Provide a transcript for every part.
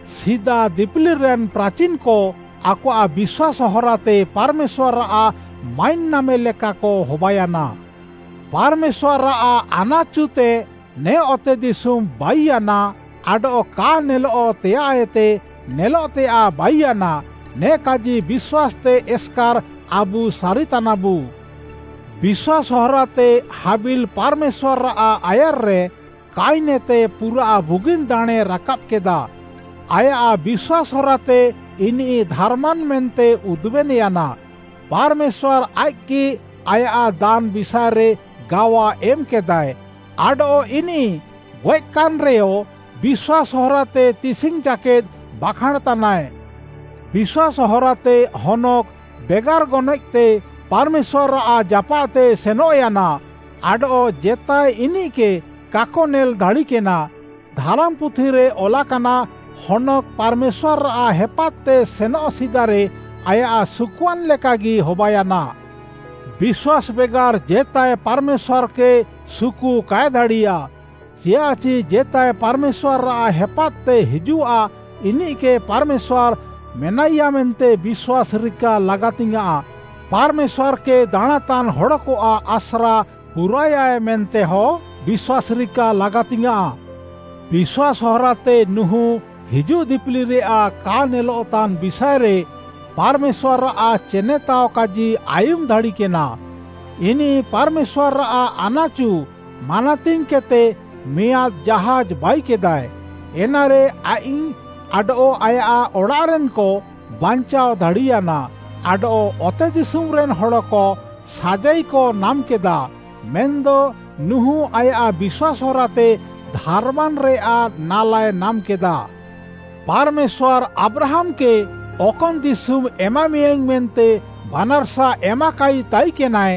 ସିଦା ଦିପିଲିରେନ୍‌ ପ୍ରାଚିନ୍‌କ ଆକଆଃ ବିଶ୍ୱାସ୍‌ ହରାତେ ପାର୍‌ମେଶ୍ୱାର୍‌ଆଃ ମାଇନ୍‌ ନାମେ ଲେକାକ ହବାୟାନା। ପାର୍‌ମେଶ୍ୱାର୍‌ଆଃ ଆନାଚୁତେ ନେ ଅତେଦିଶୁମ୍‌ ବାଇୟାନା ଆଡଃ କା ନେଲଃତେୟାଃଏତେ ନେଲଃତେୟାଃ ବାଇୟାନା, ନେ କାଜି ବିଶ୍ୱାସ୍‌ତେ ଏସ୍‌କାର୍‌ ଆବୁ ସାରିତାନାବୁ। ବିଶ୍ୱାସ୍‌ ହରାତେ ହାବିଲ୍‌ ପାର୍‌ମେଶ୍ୱାର୍‌ଆଃ ଆୟାର୍‌ରେ କୟିନ୍‌ଏତେ ପୁରାଃ ବୁଗିନ୍‌ ଦାଣେଁ ରାକାବ୍‌କେଦା। ଆୟାଃ ବିଶ୍ୱାସ୍‌ ହରାତେ ଇନିଃ ଧାର୍‌ମାନ୍‌ ମେନ୍ତେ ଉଦୁବେନ୍‌ୟାନା, ପାର୍‌ମେଶ୍ୱାର୍‌ ଆଇଃକ୍‌ଗି ଆୟାଃ ଦାନ୍‌ ବିଷାଏରେ ଗାୱା ଏମ୍‌କେଦାଏ, ଆଡଃ ଇନିଃ ଗଏଃକାନ୍‌ରେୟ ବିଶ୍ୱାସ୍‌ ହରାତେ ତିସିଙ୍ଗ୍‌ ଜାକେଦ୍‌ ବାଖାଁଣ୍‌ତାନାଏ। ବିଶ୍ୱାସ୍‌ ହରାତେ ହନୋକ୍‌ ବେଗାର୍‌ ଗନଏଃତେ ପାର୍‌ମେଶ୍ୱାର୍‌ଆଃ ଜାପାଃତେ ସେନଃୟାନା ଆଡଃ ଜେତାଏ ଇନିଃକେ କାକ ନେଲ୍‌ ଦାଡ଼ିକେନା। ଧାରାମ୍‌ ପୁଥିରେ ଅଲାକାନା, ହନୋକ୍‌ ପାର୍‌ମେଶ୍ୱାର୍‌ଆଃ ହେପାଦ୍‌ତେ ସେନଃ ସିଦାରେ ଆୟାଃ ସୁକୁଆନ୍‌ ଲେକାଗି ହବାୟାନା। ବିଶ୍ୱାସ୍‌ ବେଗାର୍‌ ଜେତାଏ ପାର୍‌ମେଶ୍ୱାର୍‌କେ ସୁକୁ କାଏ ଦାଡ଼ିୟା, ଚିୟାଃଚି ଜେତାଏ ପାର୍‌ମେଶ୍ୱାର୍‌ଆଃ ହେପାଦ୍‌ତେ ହିଜୁଃଆ ଇନିଃକେ ପାର୍‌ମେଶ୍ୱାର୍‌ ମେନାଇୟା ମେନ୍ତେ ବିଶ୍ୱାସ୍‌ ରିକା ଲାଗାତିଙ୍ଗ୍‌ୟାଁଃ, ପାର୍‌ମେଶ୍ୱାର୍‌କେ ଦାଣାଁଁତାନ୍‌ ହଡ଼କଆଃ ଆସ୍ରା ପୁରାଏୟାଏ ମେନ୍ତେହଁ ବିଶ୍ୱାସ୍‌ ରିକା ଲାଗାତିଙ୍ଗ୍‌ୟାଁଃ। ବିଶ୍ୱାସ୍‌ ହରାତେ ନୁହୁଁ ହିଜୁଃ ଦିପିଲିରେୟାଃ କା ନେଲଃତାନ୍‌ ବିଷାଏରେ ପାର୍‌ମେଶ୍ୱାର୍‌ଆଃ ଚେନେତାଅ କାଜି ଆୟୁମ୍‌ ଦାଡ଼ିକେନା। ଇନିଃ ପାର୍‌ମେଶ୍ୱାର୍‌ଆଃ ଆନାଚୁ ମାନାତିଙ୍ଗ୍‌କେଦ୍‌ତେ ମିଆଁଦ୍‌ ଜାହାଜ୍‌ ବାଇକେଦାଏ। ଏନାରେ ଆଇଃକ୍‌ ଆଡଃ ଆୟାଃ ଅଡ଼ାଃରେନ୍‌କ ବାଞ୍ଚାଅ ଦାଡ଼ିୟାନା। ଆଡଃ ଅତେଦିଶୁମ୍‌ରେନ୍‌ ହଡ଼କ ସାଜାଇକ ନାମ୍‌କେଦା, ମେନ୍‌ଦ ନୁହୁଁ ଆୟାଃ ବିଶ୍ୱାସ୍‌ ହରାତେ ଧାର୍‌ମାନ୍‌ରେୟାଃ ନାଲାଏ ନାମ୍‌କେଦା। ପାର୍‌ମେଶ୍ୱାର୍‌ ଆବ୍ରାହାମ୍‌କେ ଅକନ୍‌ ଦିଶୁମ୍‌ ଏମାମେୟାଁଇଙ୍ଗ୍‌ ମେନ୍ତେ ବାନାର୍‌ସା ଏମାକାଇ ତାଇକେନାଏ,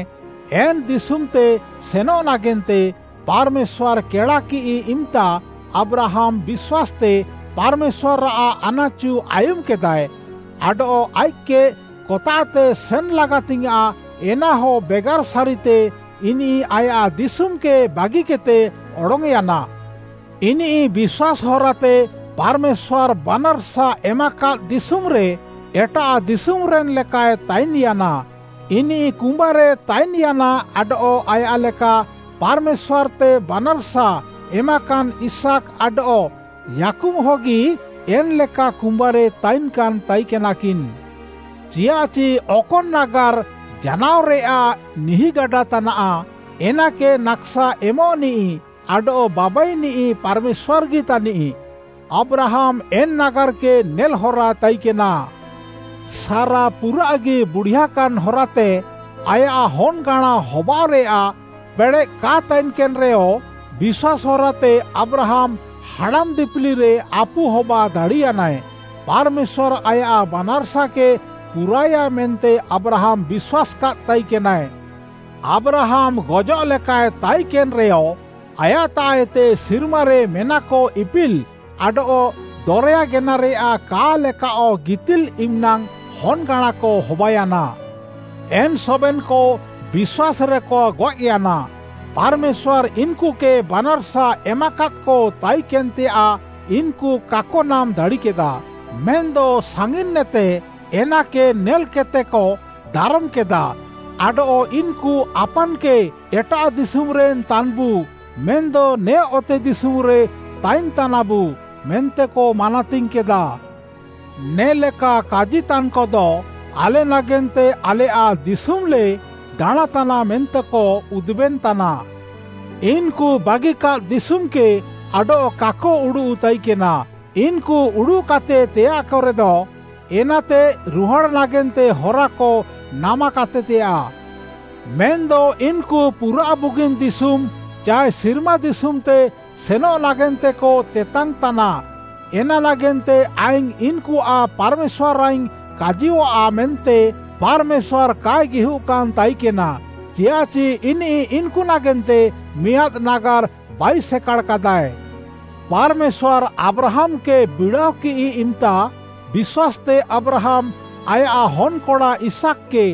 ଏନ୍‌ ଦିଶୁମ୍‌ତେ ସେନଃ ନାଗେନ୍ତେ ପାର୍‌ମେଶ୍ୱାର୍‌ କେଡ଼ାକିଃ ଇମ୍‌ତା ଆବ୍ରାହାମ୍‌ ବିଶ୍ୱାସ୍‌ତେ ପାର୍‌ମେଶ୍ୱାର୍‌ଆଃ ଆନାଚୁ ଆୟୁମ୍‌କେଦାଏ, ଆଡଃ ଆଇଃକ୍‌କେ କତାଃତେ ସେନ୍‌ ଲାଗାତିଙ୍ଗ୍‌ୟାଁଃ ଏନାହ ବେଗାର୍‌ ସାରିତେ ଇନିଃ ଆୟାଃ ଦିଶୁମ୍‌କେ ବାଗିକେଦ୍‌ତେ ଅଡଙ୍ଗ୍‌ୟାନା। ଇନିଃ ବିଶ୍ୱାସ୍‌ ହରାତେ ପାର୍‌ମେଶ୍ୱାର୍‌ ବାନାର୍‌ସା ଏମାକାଦ୍‌ ଦିଶୁମ୍‌ରେ ଏଟାଃ ଦିଶୁମ୍‌ରେନ୍‌ ଲେକାଏ ତାଇନ୍‌ୟାନା। ଇନିଃ କୁମ୍ବାରେ ତାଇନ୍‌ୟାନା ଆଡଃ ଆୟାଃ ଲେକା ପାର୍‌ମେଶ୍ୱାର୍‌ତେ ବାନାର୍‌ସା ଏମାକାନ୍‌ ଇସାକ୍‌ ଆଡଃ ଯାକୁବ୍‌ହଗି ଏନ୍‌ଲେକା କୁମ୍ୱାରେ ତାଇନ୍‌କାନ୍‌ ତାଇକେନାକିନ୍‌। ଚିୟାଃଚି ଅକନ୍‌ ନାଗାର୍‌ ଜାନାଅରେୟାଃ ନିହିଁଗାଡା ତାନାଃ, ଏନାକେ ନାକ୍‌ସା ଏମ୍‌ନିଃ ଆଡଃ ବାବାଇନିଃ ପାର୍‌ମେଶ୍ୱାର୍‌ଗି ତାନିଃ। ଆବ୍ରାହାମ୍‌ ଏନ୍‌ ନାଗାର୍‌କେ ନେଲ୍‌ହରା ତାଇକେନା। ସାରା ପୁରାଃଗି ବୁଡିଆକାନ୍‌ ହରାତେ ଆୟାଃ ହନ୍‌ଗାଁଣା ହବାଅଃରେୟାଃ ପେଡ଼େଃ କା ତାଇକେନ୍‌ରେୟ, ବିଶ୍ୱାସ୍‌ ହରାତେ ଆବ୍ରାହାମ୍‌ ହାଡ଼ାମ୍‌ ଦିପିଲିରେ ଆପୁ ହବା ଦାଡ଼ିୟାନାଏ। ପାର୍‌ମେଶ୍ୱାର୍‌ ଆୟାଃ ବାନାର୍‌ସାକେ ପୁରାଏୟା ମେନ୍ତେ ଆବ୍ରାହାମ୍‌ ବିଶ୍ୱାସ୍‌କାଦ୍‌ ତାଇକେନାଏ। ଆବ୍ରାହାମ୍‌ ଗଜଃଲେକାଏ ତାଇକେନ୍‌ରେୟ, ଆୟାଃତାଃଏତେ ସିର୍ମାରେ ମେନାକ ଇପିଲ୍‌ ଆଡଃ ଦରେୟା ଗେନାରେୟାଃ କା ଲେକାଅଃ ଗିତିଲ୍‌ ଇମ୍‌ନାଙ୍ଗ୍‌ ହନ୍‌ଗାଁଣାକ ହବାୟାନା। ଏନ୍‌ ସବେନ୍‌କ ବିଶ୍ୱାସ୍‌ରେକ ଗଏଃୟାନା। ପାର୍‌ମେଶ୍ୱାର୍‌ ଇନ୍‌କୁକେ ବାନାର୍‌ସା ଏମାକାଦ୍‌କ ତାଇକେନ୍‌ତେୟାଃ ଇନ୍‌କୁ କାକ ନାମ୍‌ ଦାଡ଼ିକେଦା, ମେନ୍‌ଦ ସାଙ୍ଗିନେତେ ଏନାକେ ନେଲ୍‌କେଦ୍‌ତେକ ଦାରମ୍‌କେଦା, ଆଡଃ ଇନ୍‌କୁ ଆପାନ୍‌କେ ଏଟାଃ ଦିଶୁମ୍‌ରେନ୍‌ ତାନ୍‌ବୁ ମେନ୍‌ଦ ନେ ଅତେଦିଶୁମ୍‌ରେ ତାଇନ୍‌ତାନାବୁ ମେନ୍ତେକ ମାନାତିଙ୍ଗ୍‌କେଦା। ନେ'ଲେକା କାଜିତାନ୍‌କଦ, ଆଲେ ନାଗେନ୍ତେ ଆଲେୟାଃ ଦିଶୁମ୍‌ଲେ ଦାଣାଁଁତାନା ମେନ୍ତେକ ଉଦୁବେନ୍‌ତାନା। ଇନ୍‌କୁ ବାଗିକାଦ୍‌ ଦିଶୁମ୍‌କେ ଆଡଃ କାକ ଉଡ଼ୁଃ ତାଇକେନା, ଇନ୍‌କୁ ଉଡ଼ୁଃକାତେ ତେୟାଃକରେଦ, ଏନ୍ତାଃତେ ରୁହାଡ଼୍‌ ନାଗେନ୍ତେ ହରାକ ନାମାକାତେତେୟାଃ। ମେନ୍‌ଦ ଇନ୍‌କୁ ପୁରାଃ ବୁଗିନ୍‌ ଦିଶୁମ୍‌, ଚାଏ ସିର୍ମା ଦିଶୁମ୍‌ତେ ସେନଃ ନାଗେନ୍ତେକ ତେତାଙ୍ଗ୍‌ତାନା। ଏନା ନାଗେନ୍ତେ ଆଇଙ୍ଗ୍‌ ଇନ୍‌କୁଆଃ ପାର୍‌ମେଶ୍ୱାରାଇଙ୍ଗ୍‌ କାଜିୟଃଆ ମେନ୍ତେ ପାର୍‌ମେଶ୍ୱାର୍‌ କାଏ ଗିହୁଃକାନ୍‌ ତାଇକେନା, ଚିୟାଃଚି ଇନିଃ ଇନ୍‌କୁ ନାଗେନ୍ତେ ମିଆଁଦ୍‌ ନାଗାର୍‌ ବାଇସେକାଡ଼ାକାଦାଏ। ପାର୍‌ମେଶ୍ୱାର୍‌ ଆବ୍ରାହାମ୍‌କେ ବିଡ଼ାଅକିଃ ଇମ୍‌ତା, ବିଶ୍ୱାସ୍‌ତେ ଆବ୍ରାହାମ୍‌ ଆୟାଃ ହନ୍‌କଡ଼ା ଇସାକ୍‌କେ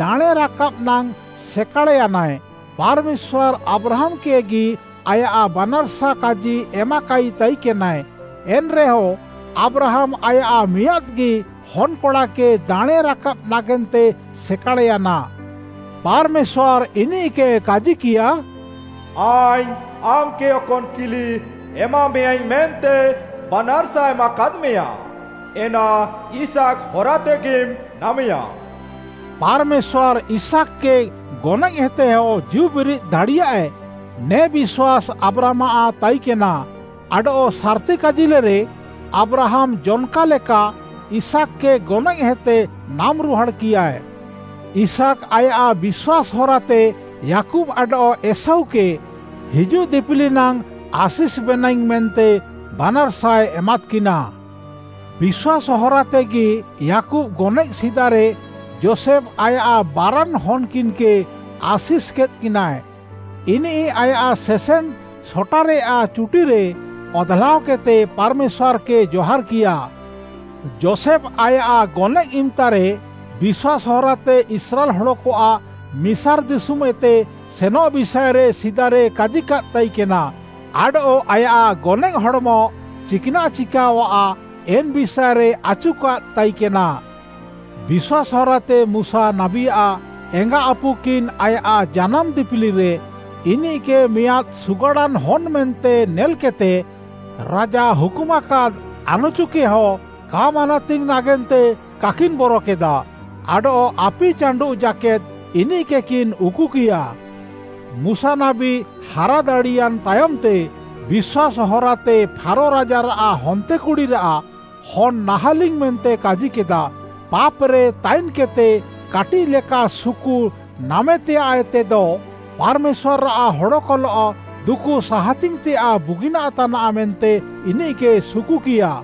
ଦାଣେଁ ରାକାବ୍‌ ନାଙ୍ଗ୍‌ ସେକାଡ଼୍‌ୟାନାଏ। ପାର୍‌ମେଶ୍ୱାର୍‌ ଆବ୍ରାହାମ୍‌କେଗି ଆୟାଃ ବାନାର୍‌ସା କାଜି ଏମାକାଇ ତାଇକେନାଏ, ଏନ୍‌ରେୟ ଆବ୍ରାହାମ୍‌ ଆୟାଃ ମିଆଁଦ୍‌ଗି ହନ୍‌କଡ଼ାକେ ଦାଣେଁ ରାକାବ୍‌ ନାଗେନ୍ତେ ସେକାଡ଼୍‌ୟାନା। ପାର୍‌ମେଶ୍ୱାର୍‌ ଇନିଃକେ କାଜିକିୟା, “ଆଇଙ୍ଗ୍‌ ଆମ୍‌କେ ଅକନ୍‌ କିଲି ଏମାମେୟାଁଇଙ୍ଗ୍‌ ମେନ୍ତେ ବାନାର୍‌ସା ଏମାକାଦ୍‌ମେୟାଁ, ଏନା ଇସାକ୍‌ ହରାତେଗିମ୍‌ ନାମେୟା।” ପାର୍‌ମେଶ୍ୱାର୍‌ ଇସାକ୍‌କେ ଗନଏଃହେତେୟ ଜୀଉବିରିଦ୍‌ ଦାଡ଼ିୟାଏ, ନେ ବିଶ୍ୱାସ୍‌ ଆବ୍ରାହାମ୍‌ଆଃ ତାଇନ୍‌କେନା। ଆଡଃ ସାର୍‌ତି କାଜିଲେରେ, ଆବ୍ରାହାମ୍‌ ଜନ୍‌କା ଲେକା ଇସାକ୍‌କେ ଗନଏଃହେତେ ନାମ୍‌ ରୁହାଡ଼୍‌କିୟା। ଇସାକ୍‌ ଆୟାଃ ବିଶ୍ୱାସ୍‌ ହରାତେ ଯାକୁବ୍‌ ଆଡଃ ଏଷୌକେ ହିଜୁଃ ଦିପିଲି ନାଙ୍ଗ୍‌ ଆଶିଷ୍‌ବେନାଇଙ୍ଗ୍‌ ମେନ୍ତେ ବାନାର୍‌ସାଏ ଏମାଦ୍‌କିନା। ବିଶ୍ୱାସ୍‌ ହରାତେଗି ଯାକୁବ୍‌ ଗନଏଃ ସିଦାରେ ଯୋଷେଫ୍‌ ଆୟାଃ ବାରାନ୍‌ ହନ୍‌କିନ୍‌କେ ଆଶିଷ୍‌କେଦ୍‌କିନା। ଇନିଃ ଆୟାଃ ସେସେନ୍‌ ସଟାରେୟାଃ ଚୁଟିରେ ଅଧ୍‌ଲାଅକେଦ୍‌ତେ ପାର୍‌ମେଶ୍ୱାର୍‌କେ ଜହାର୍‌କିୟା। ଯୋଷେଫ୍‌ ଆୟାଃ ଗନଏଃ ଇମ୍‌ତାରେ ବିଶ୍ୱାସ୍‌ ହରାତେ ଇସ୍ରାଏଲ୍‌ ହଡ଼କଆଃ ମିସାର୍‌ ଦିଶୁମ୍‌ଏତେ ସେନଃ ବିଷାଏରେ ସିଦାରେ କାଜିକାଦ୍‌ ତାଇକେନା, ଆଡଃ ଆୟାଃ ଗନଏଃ ହଡ଼୍‌ମ ଚିକ୍‌ନାଃ ଚିକାଅଃଆ ଏନ୍‌ ବିଷାଏରେ ଆଚୁକାଦ୍‌ ତାଇକେନା। ବିଶ୍ୱାସ୍‌ ହରାତେ ମୁଶା ନାବୀଆଃ ଏଙ୍ଗାଆପୁକିନ୍‌ ଆୟାଃ ଜାନାମ୍‌ ଦିପିଲିରେ ଇନିଃକେ ମିଆଁଦ୍‌ ସୁଗାଡ଼ାନ୍‌ ହନ୍‌ ମେନ୍ତେ ନେଲ୍‌କେଦ୍‌ତେ ରାଜା ହୁକୁମାକାଦ୍‌ ଆନାଚୁକେହଁ କା ମାନାତିଙ୍ଗ୍‌ ନାଗେନ୍ତେ କାକିନ୍‌ ବରକେଦା, ଆଡଃ ଆପି ଚାଣ୍ଡୁଃ ଜାକେଦ୍‌ ଇନିଃକେକିନ୍‌ ଉକୁକିୟା। ମୁଶା ନାବୀ ହାରା ଦାଡ଼ିୟାନ୍‌ ତାୟମ୍‌ତେ ବିଶ୍ୱାସ୍‌ ହରାତେ ଫାରୋ ରାଜାରାଃ ହନ୍ତେକୁଡ଼ିରାଃ ହନ୍‌ ନାହାଁଲିଙ୍ଗ୍‌ ମେନ୍ତେ କାଜିକେଦା ପାପ୍‌ରେ ତାଇନ୍‌କେଦ୍‌ତେ କାଟିଃ ଲେକା ସୁକୁ ନାମେତେୟାଃଏତେଦ ପାର୍‌ମେଶ୍ୱାର୍‌ଆଃ ହଡ଼କଲଃ ଦୁକୁ ସାହାତିଙ୍ଗ୍‌ତେୟାଃ ବୁଗିନାଃ ତାନାଃ ମେନ୍ତେ ଇନିଃକେ ସୁକୁକିୟା।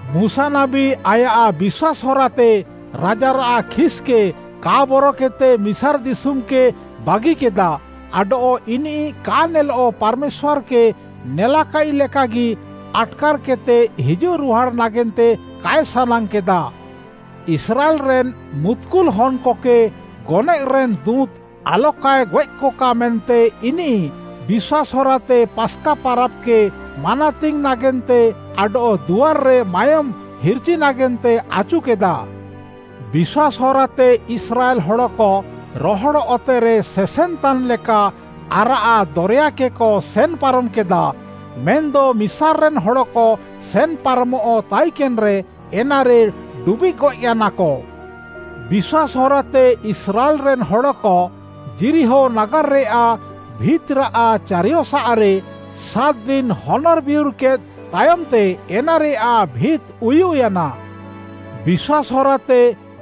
ମୁଶା ନାବୀ ଆୟାଃ ବିଶ୍ୱାସ୍‌ ହରାତେ ରାଜାରାଃ ଖିସ୍‌କେ କା ବରକେଦ୍‌ତେ ମିସାର୍‌ ଦିଶୁମ୍‌କେ ବାଗିକେଦା, ଆଡଃ ଇନିଃ କା ନେଲଃ ପାର୍‌ମେଶ୍ୱାର୍‌କେ ନେଲାକାଇଃ ଲେକାଗି ଆଟ୍‌କାର୍‌କେଦ୍‌ତେ ହିଜୁଃ ରୁହାଡ଼୍‌ ନାଗେନ୍ତେ କାଏ ସାନାଙ୍ଗ୍‌କେଦା। ଇସ୍ରାଏଲ୍‌ରେନ୍‌ ମୁତ୍‌କୁଲ୍‌ ହନ୍‌କକେ ଗନଏଃରେନ୍‌ ଦୁଁତ୍‌ ଆଲକାଏ ଗଏଃକକା ମେନ୍ତେ ଇନିଃ ବିଶ୍ୱାସ୍‌ ହରାତେ ପାସ୍‌କା ପାରାବ୍‌କେ ମାନାତିଙ୍ଗ୍‌ ନାଗେନ୍ତେ ଆଡଃ ଦୁଆର୍‌ରେ ମାୟୋମ୍‌ ହିର୍‌ଚି ନାଗେନ୍ତେ ଆଚୁକେଦା। ବିଶ୍ୱାସ୍‌ ହରାତେ ଇସ୍ରାଏଲ୍‌ ହଡ଼କ ରହଡ଼୍‌ ଅତେରେ ସେସେନ୍‌ତାନ୍‌ ଲେକା ଆରାଃ ଦରେୟାକେକ ସେନ୍‌ ପାରମ୍‌କେଦା, ମେନ୍‌ଦ ମିସାର୍‌ରେନ୍‌ ହଡ଼କ ସେନ୍‌ ପାରମଃ ତାଇକେନ୍‌ରେ, ଏନାରେ ଡୁବିଃଗ୍‌ ଗଏଃୟାନାକ। ବିଶ୍ୱାସ୍‌ ହରାତେ ଇସ୍ରାଏଲ୍‌ରେନ୍‌ ହଡ଼କ ଯିରିହୋ ନାଗାର୍‌ରେୟାଃ ଭିତ୍‌ରାଃ ଚାରିୟସାଃରେ ସାତ୍‌ ଦିନ୍‌ ହନର୍‌ ବିୟୁର୍‌କେଦ୍‌ ତାୟମ୍‌ତେ ଏନାରେୟାଃ ଭିତ୍‌ ଉୟୁଃୟାନା। ବିଶ୍ୱାସ୍‌ ହରାତେ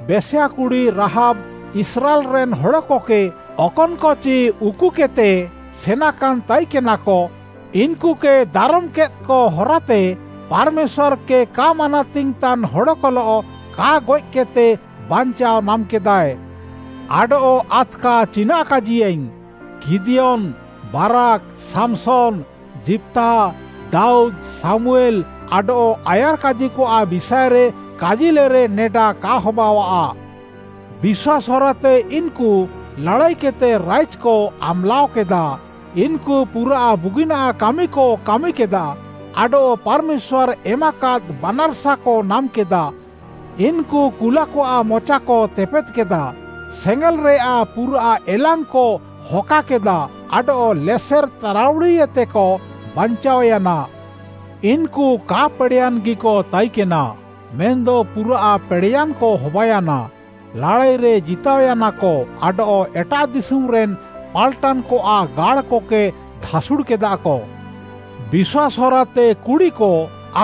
ବେଶ୍ୱା କୁଡ଼ି ରାହାବ୍‌, ଇସ୍ରାଏଲ୍‌ରେନ୍‌ ହଡ଼କକେ ଅକନ୍‌କଚି ଉକୁକେଦ୍‌ତେ ସେନାକାନ୍‌ ତାଇକେନାକ, ଇନ୍‌କୁକେ ଦାରମ୍‌କେଦ୍‌କ ହରାତେ ପାର୍‌ମେଶ୍ୱାର୍‌କେ କା ମାନାତିଙ୍ଗ୍‌ତାନ୍‌ ହଡ଼କଲଃ କା ଗଏଃକେଦ୍‌ତେ ବାଞ୍ଚାଅ ନାମ୍‌କେଦାଏ। ଆଡଃ ଆଦ୍‌କା ଚିନାଃ କାଜିୟାଇଙ୍ଗ୍‌? ଗିଦିୟନ୍‌, ବାରାକ୍‌, ସାମ୍‌ସନ୍‌, ଯିପ୍ତାହ, ଦାଉଦ୍‌, ଶାମୁଏଲ୍‌ ଆଡଃ ଆୟାର୍‌କାଜିକଆଃ ବିଷାଏରେ କାଜିଲେରେ, ନେଡା କା ହବାଅଃଆ। ବିଶ୍ୱାସ୍‌ ହରାତେ ଇନ୍‌କୁ ଲାଡ଼ାଇକେଦ୍‌ତେ ରାଇଜ୍‌କ ଆମ୍‌ଲାଅକେଦା। ଇନ୍‌କୁ ପୁରାଃ ବୁଗିନାଃ କାମିକ କାମିକେଦା ଆଡଃ ପାର୍‌ମେଶ୍ୱାର୍‌ ଏମାକାଦ୍‌ ବାନାର୍‌ସାକ ନାମ୍‌କେଦା। ଇନ୍‌କୁ କୁଲାକଆଃ ମଚାକ ତେପେଦ୍‌କେଦା, ସେଙ୍ଗେଲ୍‌ରେୟାଃ ପୁରାଃ ଏଲାଙ୍ଗ୍‌କ ହକାକେଦା ଆଡଃ ଲେସେର୍‌ ତାରାଉଡ଼ିଏତେକ ବାଞ୍ଚାଅୟାନା। ଇନ୍‌କୁ କା ପେଡ଼େୟାନ୍‌ଗିକ ତାଇକେନା, ମେନ୍‌ଦ ପୁରାଃ ପେଡ଼େୟାନ୍‌କ ହବାୟାନା, ଲାଡ଼ାଇରେ ଜିତାଅୟାନାକ ଆଡଃ ଏଟାଃ ଦିଶୁମ୍‌ରେନ୍‌ ପାଲ୍‌ଟାନ୍‌କଆଃ ଗାଡ଼୍‌କକେ ଧାସୁଡ଼୍‌କେଦାକ। ବିଶ୍ୱାସ୍‌ ହରାତେ କୁଡ଼ିକ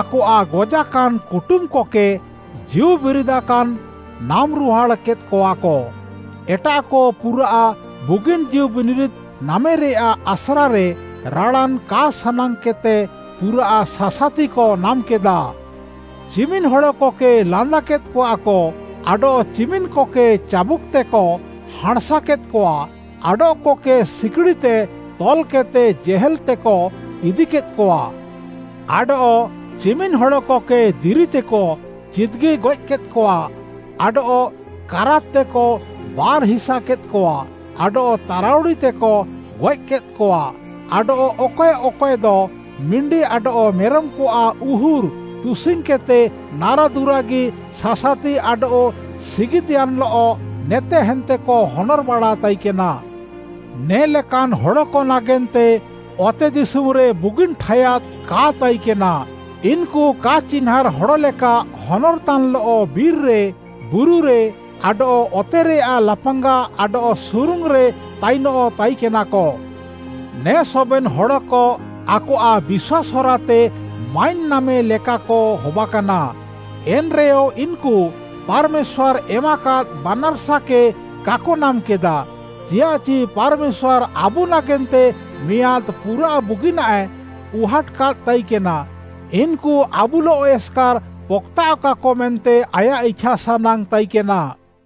ଆକଆଃ ଗଜାକାନ୍‌ କୁଟୁମ୍‌କକେ ଜୀଉବିରିଦାକାନ୍‌ ନାମ୍‌ରୁହାଡ଼୍‌ କେଦ୍‌କଆକ। ଏଟାଃକ ପୁରାଃ ବୁଗିନ୍‌ ଜୀଉବିନିରିଦ୍‌ ନାମେରେୟାଃ ଆସ୍ରାରେ, ରାଡ଼ାନ୍‌ କା ସାନାଙ୍ଗ୍‌କେଦ୍‌ତେ ପୁରାଃ ସାସାତିକ ନାମ୍‌କେଦା। ଚିମିନ୍‌ ହଡ଼କକେ ଲାନ୍ଦାକେଦ୍‌କଆକ, ଆଡଃ ଚିମିନ୍‌କକେ ଚାବୁକ୍‌ତେକ ହାଁଣ୍‌ସାକେଦ୍‌କଆ, ଆଡଃକକେ ସିକିଡ଼ିତେ ତଲ୍‌କେଦ୍‌ତେ ଜେହେଲ୍‌ତେକ ଇଦିକେଦ୍‌କଆ। ଆଡଃ ଚିମିନ୍‌ ହଡ଼କକେ ଦିରିତେକ ଚିଦ୍‌ଗି ଗଏଃକେଦ୍‌କଆ ଆଡଃ କାରାତ୍‌ତେକ ବାର୍‌ ହିସାକେଦ୍‌କଆ, ଆଡଃ ତାରାଉଡ଼ିତେକ ଗଏଃକେଦ୍‌କଆ, ଆଡଃ ଅକଏ ଅକଏଦ ମିଣ୍ଡି ଆଡଃ ମେରମ୍‌କଆଃ ଉହୁର୍‌ ତୁସିଙ୍ଗ୍‌କେଦ୍‌ତେ ନାରାଦୁରାଗି, ସାସାତି ଆଡଃ ସିଗିଦ୍‌ୟାନ୍‌ଲଃ ନେତେ ହାନ୍ତେକ ହନର୍‌ବାଡ଼ା ତାଇକେନା। ନେ ଲେକାନ୍‌ ହଡ଼କ ନାଗେନ୍ତେ ଅତେଦିଶୁମ୍‌ରେ ବୁଗିନ୍‌ ଠାୟାଦ୍‌ କା ତାଇକେନା। ଇନ୍‌କୁ କା ଚିହ୍ନାଁର୍‌ ହଡ଼ ଲେକା ହନର୍‌ତାନ୍‌ଲଃ ବିର୍‌ରେ, ବୁରୁରେ, ଆଡଃ ଅତେରେୟାଃ ଲାପାଙ୍ଗା ଆଡଃ ସୁରୁଙ୍ଗ୍‌ରେ ତାଇନଃ ତାଇକେନାକ। ନେ ସବେନ୍‌ ହଡ଼କ ଆକଆଃ ବିଶ୍ୱାସ୍‌ ହରାତେ ମାଇନ୍‌ ନାମେଲେକାକ ହବାକାନା। ଏନ୍‌ରେୟ ଇନ୍‌କୁ ପାର୍‌ମେଶ୍ୱାର୍‌ ଏମାକାଦ୍‌ ବାନାର୍‌ସାକେ କାକ ନାମ୍‌କେଦା, ଚିୟାଃଚି ପାର୍‌ମେଶ୍ୱାର୍‌ ଆବୁ ନାଗେନ୍ତେ ମିଆଁଦ୍‌ ପୁରାଃ ବୁଗିନାଃଏ ଉହାଟ୍‌କାଦ୍‌ ତାଇକେନା। ଇନ୍‌କୁ ଆବୁଲଃ ଏସ୍‌କାର୍‌ ପକ୍‌ତାଃଅକାକ ମେନ୍ତେ ଆୟାଃ ଇଛାସାନାଙ୍ଗ୍‌ ତାଇକେନା।